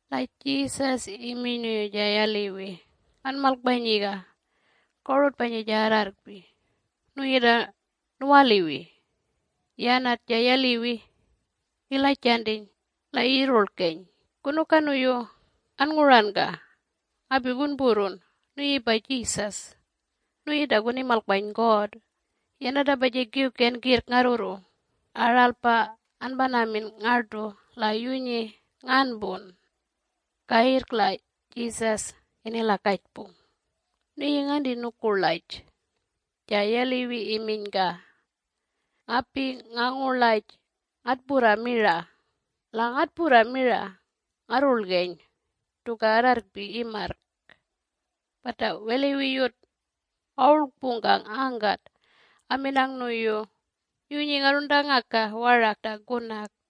La Jesus iminy nuyu ja yaliwi, “Anmalkpanyiga korutpanyi ja arrarrkpi, nuyi ta nuwaliwi.” Yanat ja yaliwi ilajantiny la iyirrurlkeny, “Kunuka nuyu annguranka? Ngapi kunpurrun. Nuyipa Jesus. Nuyi ta kunimalkpany God. Yanatapa ja kiwken kirrk ngarrurru. Aralpa anpanamin ngartu la yunyi nganpun!” Kayirrk la Jesus inilakajpung, “Nuyi nganti nukurlaj?” Ja yaliwi iminyka, “Ngapi ngangurlaj Ngatpurra mira, la ngatpurra mira ngarrulgeny tuka arrarrkpi imarrk.” Pata weliwiyut awurlkpungkang angkat aminang nuyu, “Yunyi ngarruntangaka warak ta kunak.”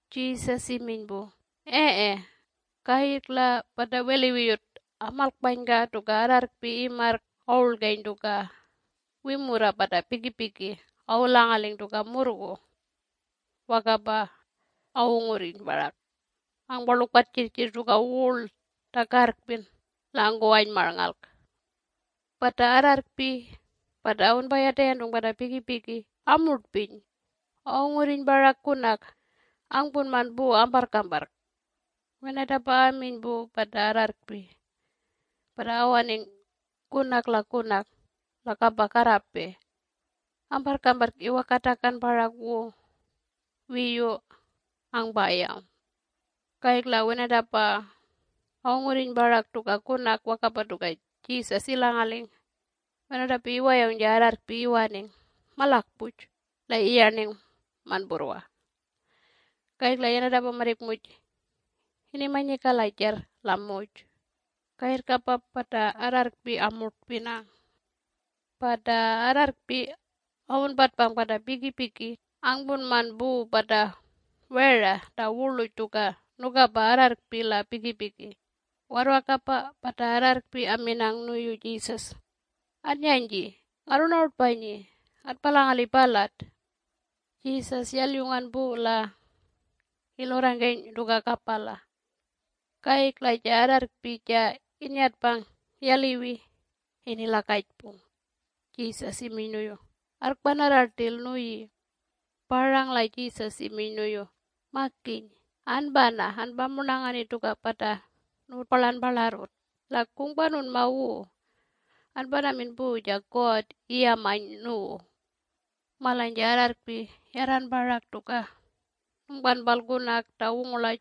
Jesus iminy pu, “Ee.” Kayirrk la pata weliwiyut amalkpanyka tuka arrarrkpi imarrk awurlgeny tuka wimurra pata pikipiki awulangaling tuka murrgu. Wakapa awungurriny parak angparlukpan jirrjirr tuka wurl ta karrkpin la angkuwany marnngalk. Pata arrarrkpi pata awunpayatayantung pata pikipiki amurtpiny awungurriny parak kunak angpunman pu amparrkpamparrk. Wenatapa aminy pu pata arrarrkpi pata awaning kunak la kunak la kapa karrapey. Amparrkamparrk iwakatakan parak wu wiyu angpayawng. Kayirrk la wenatapa awungurriny parak tuka kunak wakapa tuka Jesus ilangaling. Wenatapa iwayawng ja arrarrkpi iwaning malakpuj la iyarning manpurrwa. Kayirrk yanatapa marrik muj inimanyi kalajarr la muj. Kayirrkapa pata arrarrkpi amurtpinang. Pata arrarrkpi awunpatpang pata pikipiki angpunman pu pata wera ta wurluj tuka nukapa arrarrkpi la pikipiki. Warrwakapa pata arrarrkpi aminang nuyu Jesus, “Anyanyji ngarrunarutpanyi ngatpalangali palat.” Jesus yalyungan pu la ilurrangkeny tuka kapala. Kayirrk la ja arrarrkpi ja innyatpang yaliwi inilakajpung Jesus iminy nuyu, “Arrkpanarra rtil nuyi.” Parang la Jesus iminy nuyu, “Makiny, anpana anpamurnangani tuka pata nuwutpalanparlarrut. La kungpanunma wu anpanamin pu ja God iyamany nuwu.” Malany ja arrarrrkpi yarran parak ta nungpanpal kunak ta wungurlaj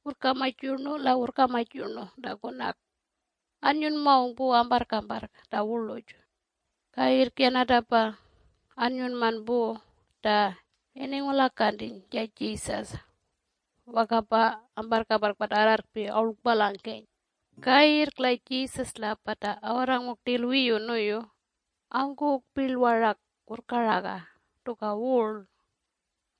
Wurrkamaj Yurnu la Wurrkamaj Yurnu ta Kunak anyunmangung pu amparrkamparrk ta wurluj. Kayirrk yanatapa annyunman pu ta iningulakantiny ja Jesus. Wakapa amparrkamparrk pata arrarrkpi awurlkpalangeny. Kayirrk la Jesus la pata awarrangung rtil wiyu nuyu angkuwung pirl warak wurrkaraga tuka wurl.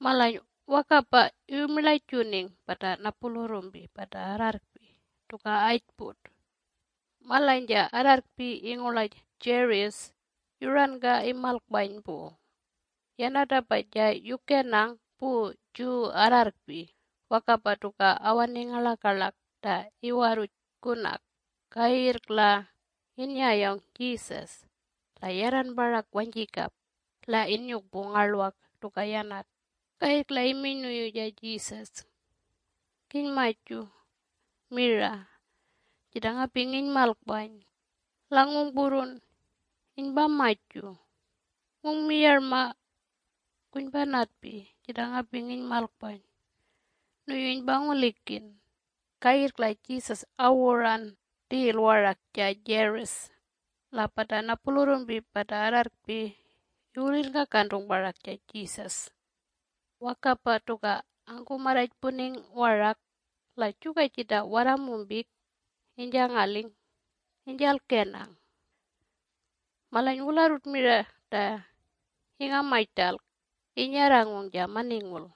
Malany wakapa iwumirlajuning pata napulurrumpi pata arrarrkpi tuka ajput. Malany ja arrarrkpi ingurlaj Jairus yuranka imalkpany pu. Yanatapa ja yukenang pu Jew arrarrkpi wakapa tuka awaning ngarlakarlak ta iwarruj kurrampalk. Kayirrk la innyayawng Jesus la yarran parak wanyjikap la inyukpung ngarlwak tuka yanat. Kayirrk la iminy nuyu ja Jesus “Kinymaju mira jita ngapi nginymalkpany la ngungpurrun inypamaju. Ngungmiyarma kunypanatpi jita ngapi nginymalkpany nuyu inypangulikin.” Kayirrk la Jesus awuran rtil warak ja Jairus la pata napulurrumpi pata arrarrakpi iwulirrngkakantung parak ja Jesus. Wakapa tuka angkumarrajpuning warak la juka jita warramumpik inyjangaling inyjalkenang. Malany wularrut mira ta ingamany rtalk innyarrangung ja maningul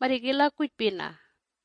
marrik ilakujpina.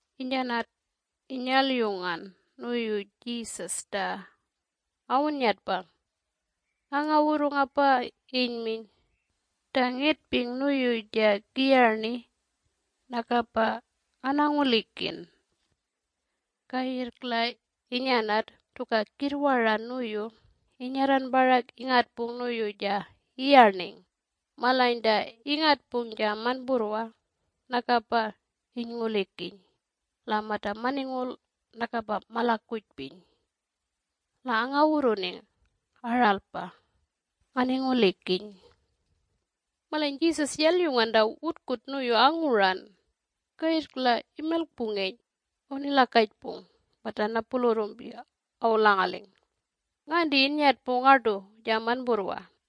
Inyanat inyalyungan nuyu Jesus ta awunnyatpang, angawurrungapa inyminy, “Ta ngetping nuyu ja kiyarni nakapa nganangulikin.” Kayirrk la inyanat tuka kirrwara nuyu inyarran parak ingatpung nuyu ja iyarning. Malany ta ingatpung ja manpurrwa nakapa inyngulikiny la mata maningul nakapa malakujpiny. La angawurruning, “Aralpa nganingulikiny.” Malany Jesus yalyungan ta wutkut nuyu anguran. Kayirrk la imilkpungeny awunilakajpung pata napulurrumpi awulangaling, “Nganti innyatpung ngartu ja manpurrwa?”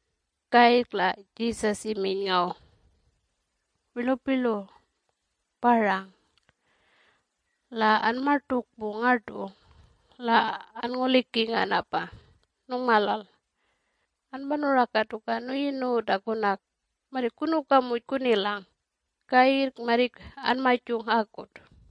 Kayirrk la Jesus iminy ngaw, “Wirlupirlu, parang la anmartukpung ngartu la anngulikinganapa nungmalal. Anpanuraka tuka nuyi nuwu ta kunak. Marrik kunuka muj kunilang. Kayirrk marrik anmajung akut!”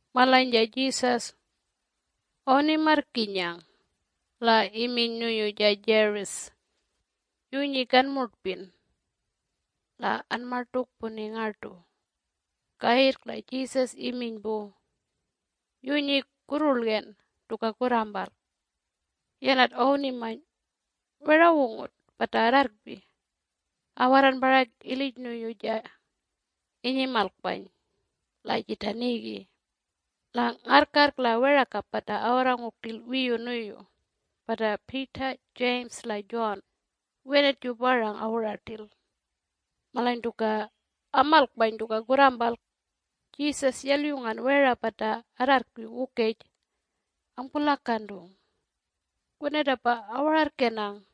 Malany ja Jesus awunimarrkinyang la iminy nuyu ja Jairus, “Yunyi kanmurtpin! La anmartukpuni ngartu!” Kayirrk la Jesus iminy pu, “Yunyi kurrurlgen tuka kurrampalk!” Yanat awunimany werawungut pata arrarrkpi awarran parak ilij nuyu ja inyimalkpany la jita nigi, la ngarrkarrk la werakap pata awarrangung rtil wiyu nuyu pata Peter, James la John wenat ju parang awuran rtil. Malany tuka amalkpany tuka kurrampalk Jesus yalyungan wera pata arrarrkpi wukej angpulakantung. Wenatapa awararrkenang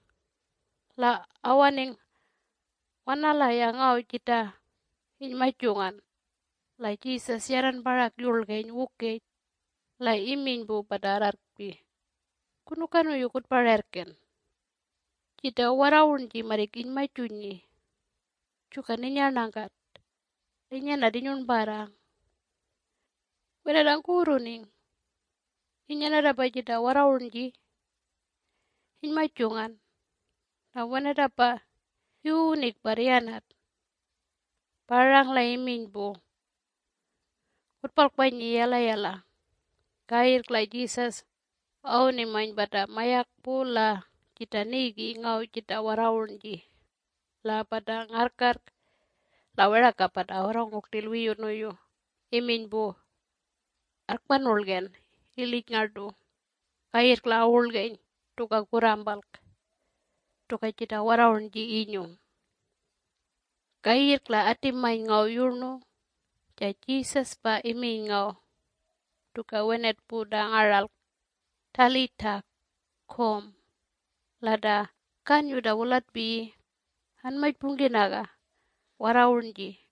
la awaning wanalaya ngaw jita inymajungan La Jesus yarran parak yurlgeny wukej la iminy pu pata arrarrkpi, “Kunuka nuyu kutpararrken? Jita warrawurnji marrik inymajunyi juka ninyarnankat la inyanat inyurnparrang.” Wenat angkuwurruning inyanatapa jita warrawurnji inymajungan la wenatapa iwuwuning parr yanat, parang la iminy pu, “Kutpalkpanyi yalayala!” Kayirrk la Jesus awunimany pata mayakpu la jita nigi ngaw jita warrawurnji la pata ngarrkarrk la werakap pata awarrangung rtil wiyu nuyu iminy pu, “Arrkpanurlgen ilij ngartu.” Kayirrk la awurlgeny tuka kurrampalk tuka jita warrawurnji inyung. Kayirrk la atimany ngaw yurnu ja Jesus pa iminy ngaw tuka wenat pu ta ngaralk, “Talitha Koum!” (La ta kanyu ta wulatpiyi “Anmajpungkinaga warrawurnji!”)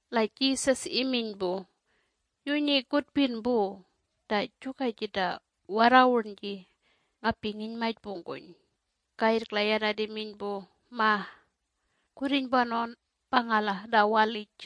La Jesus iminy pu, “Yunyi kutpin pu ta juka jita warrawurnji ngapi nginymajpungkuny.” Kayirrk la yanat iminy pu, “Ma! Kurrinypanawn apangala ta walij.”